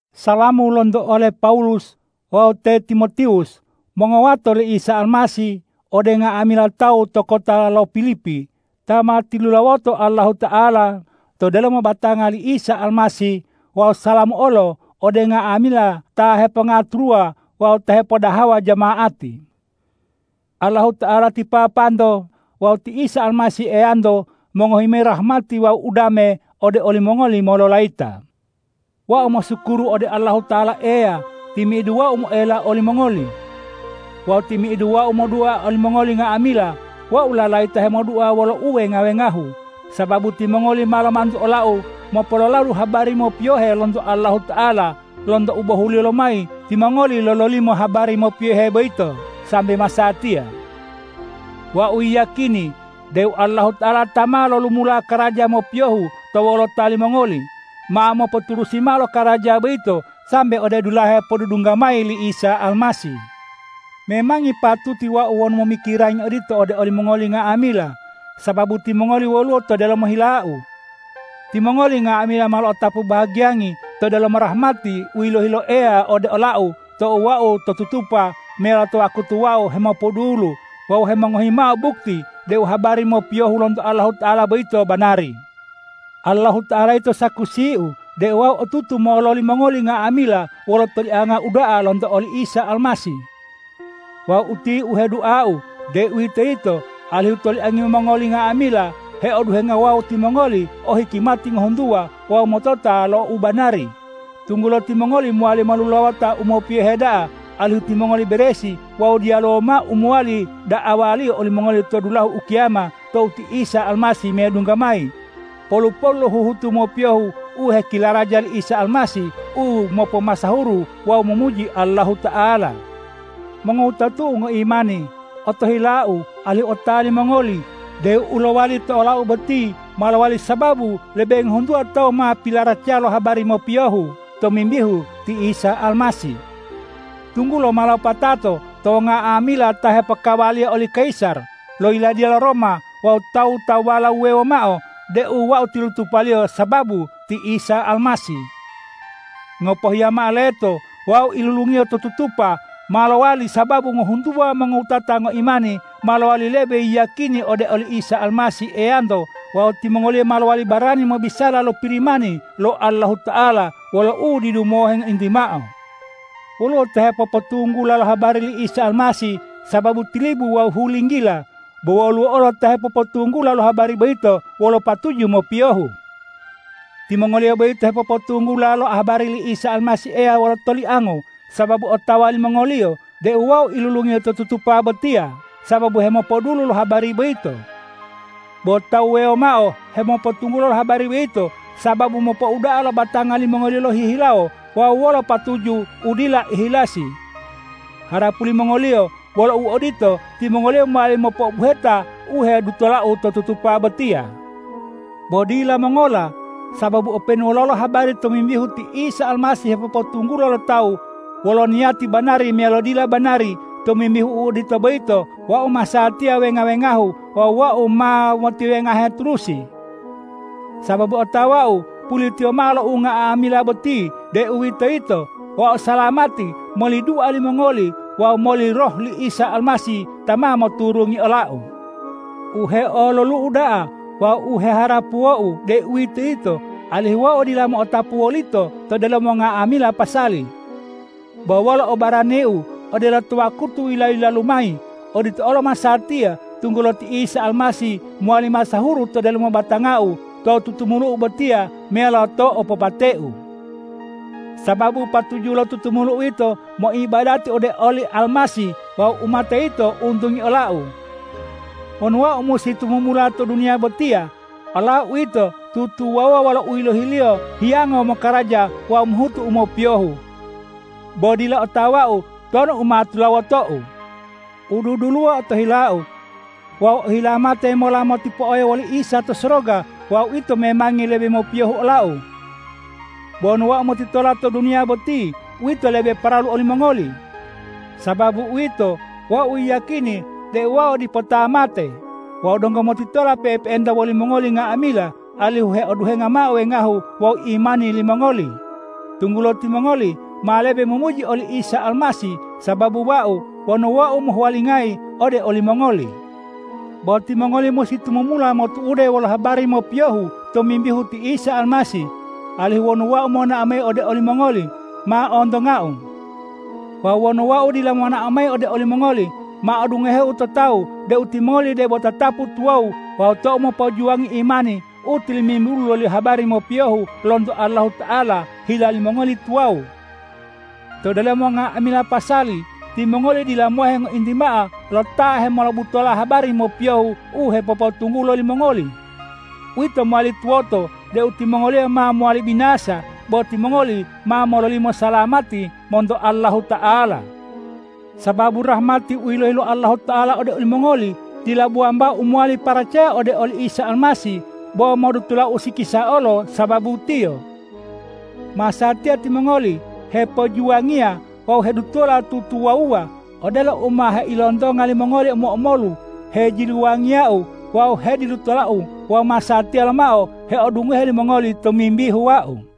Salamu lonto ole Pawulus wawu te Timotiwus, mongowato li Isa Almasih, ode nga'amila tawu to kota lo Pilipi ta ma tilulawoto Allahuta'ala to delomo batanga li Isa Almasih wawu salamu olo ode nga'amila ta hepongaturuwa wawu ta hepodahawa jama'ati. Allahuta'ala ti Papanto wawu ti Isa Almasih Eyanto mongohi mayi rahmati wawu udame ode olimongoli mololayita. Wau mosukuru ode Allahuta'ala Eyau timi'idu wau moela olimongoli. Wawu timi'idu wau modua olimongoli nga'amila, wau lalayita hemodua wolo uwenga-wengahu, sababu timongoli ma lomantu olau mopololadu habari mopiyohe lonto Allahuta'ala lonto u bohuliyo lomayi timongoli lololimo habari mopiyohe boyito sambe masatiya. Wau yiyakini deu Allahuta'ala ta ma lolumula karaja mopiyohu to wolota limongoli, ma mopoturusi mao lokaraja boyito sambe ode dulahe podudungga mayi li Isa Almasih. Memangi patuti wonu wau momikirangi odito ode olimongoli nga'amila, sababu timongoli woluwo to delomo hilau. Timongoli nga'amila ma lo'otapu bahagiyangi to delomo rahmati u yilohi lo Eya ode olau tou wau to tutupa meyalo to wakutu wau hemopodulu wawu hemongohi mao bukti deu habari mopiyohu lonto Allahuta'ala boyito banari. Allahuta'ala yito sakusiu deu wau otutu mololi mongoli nga'amila wolo tolianga uda'a lonto oli Isa Almasih. Wawu utiye u heduau, deuwitoyito alihu toliangi mongoli nga'amila heoduhenga wawu timongoli o hikimati ngohuntuwa wawu motota lo u banari, tunggulo timongoli mowali molulawota u mopiyohe da'a, alihu timongoli beresi wawu diyaluwo mao u mowali da'awaliyo olimongoli to dulahu ukiyama tou ti Isa Almasih medungga mayi, polu-polu lo huhutu mopiyohu u hekilaraja li Isa Almasih u mopomasahuru wawu momuji Allahuta'ala. Mongowutatu'u ngoimani, otohilau alihu otawa limongoli deu u lowali to olau boti ma lowali sababu lebe ngohuntuwa tawu ma pilaracaya lo habari mopiyohu tomimbihu ti Isa Almasih, tunggulo ma lopatato to nga'amila ta hepokawaliya oli kayisar lo yiladiya lo Roma wawu tawu-tawuwala wuwewo mao deu wau tilutupaliyo sababu ti Isa Almasih. Ngopohiya mao leto, wau ilulungiyo to tutupa ma lowali sababu ngohuntuwa mongowutata ngoimani ma lowali lebe yiyakini ode oli Isa Almasih Eyanto wawu timongoliyo ma lowali barani mobisala lo Pirimani lo Allahuta'ala wolo u didu mohe ngointi mao. Woluwo ta hepopotunggula lo habari li Isa Almasih sababu tilibu wawu hulinggila, bo woluwo olo ta hepopotunggula lo habari boyito wolo patuju mopiyohu. Timongoliyo boyito hepopotunggula lo habari li Isa Almasih Eya wolo toliango, sababu otawa limongoliyo deu wau ilulungiyo to tutupa botiya sababu hemopodulu lo habari boyito. Bo tawu wuwewo mao hepopotunggula lo habari boyito sababu mopouda'a lo batanga limongoliyo lohihilawo wawu wolo patuju u dila ihilasi. Harapu limongoliyo wolo u odito, timongoliyo mowali mopo'obuheta u hedutolau to tutupa botiya. Bo dila mongola, sababu openu wololo habari tomimbihu ti Isa Almasih hepopotunggulo lo tawu, wolo niyati banari meyalo dila banari, tomimbihu u odito boyito, wau masatiya wenga-wengahu wawu wau ma motiwengahe turusi. Sababu otawau pulitiyo mao lo unga'amila boti, deuwitoyito wau salamati moli dua limongoli wawu moli Roh li Isa Almasih ta ma moturungi olau. U heololu'u da'a wawu u heharapuwou, deuwitoyito alihu wau dila mo'otapu wolito to delomo nga'amila pasali. Bo wolo obaraniu odelo to wakutu yila-yilalu mayi, odito olo masatiya, tunggulo ti Isa Almasih mowali masahuru to delomo batangau, to tutumulu'u botiya meyalo to opopateu. Sababu patuju lo tutumulu'u yito moibadati ode oli Almasih wawu umate yito untungi olau. Wonu wau musi tumumula to duniya botiya, olau uwito tutuwawuwa wolo u yilohiyaliyo hiyango mokaraja wawu mohutu u mopiyohu. Bo dila otawau tonu u ma tulawotou. U duduluwo otohilau. Wau ohilawo mate mola motipo'oyo woli Isa to soroga wawu uwito memangi lebe mopiyohu olau. Bo wonu wau motitola to duniya boti, uwito lebe paralu olimongoli. Sababu uwito, wau yiyakini deu wau dipo ta mate wawu donggo motitola pe'epe'enta wolimongoli nga'amila alihu heoduhenga mao wengahu wawu imani limongoli, tunggulo timongoli ma lebe momuji oli Isa Almasih sababu wau wonu wau mohuwalingayi ode olimongoli. Bo timongoli musi tumumula motu'ude wolo habari mopiyohu tomimbihu ti Isa Almasih, alihu wonu wau monao mayi ode olimongoli, ma ontongau. Wawu wonu wau dila monao mayi ode olimongoli, ma odungoheu to tawu deu timongoli debo tatapu tuwawu wawu tou mopojuwangi imani u tilimimbulu loli habari mopiyohu lonto Allahuta'ala, hila limongoli tuwawu. To delomo nga'amila pasali timongoli dila mohe ngointi mao lo ta hemolobutola habari mopiyohu u hepopotunggulo limongoli. Uwito mowali tuwoto deu timongoliyo ma mowali binasa, bo timongoli ma mololimo salamati monto Allahuta'ala. Sababu rahmati u yilohi lo Allahuta'ala ode olimongoli dila bo wambao u mowali paracaya ode oli Isa Almasih, bo modutola usikisa olo sababu Tiyo. Masatiya timongoli hepojuwangiya wawu hedutola tutuwawuwa, odelo u ma heilontonga limongoli omo-omolu hejiluwangiyau wawu hedilutolau wawu masatiya lomao heodungohe limongoli tomimbihu wau.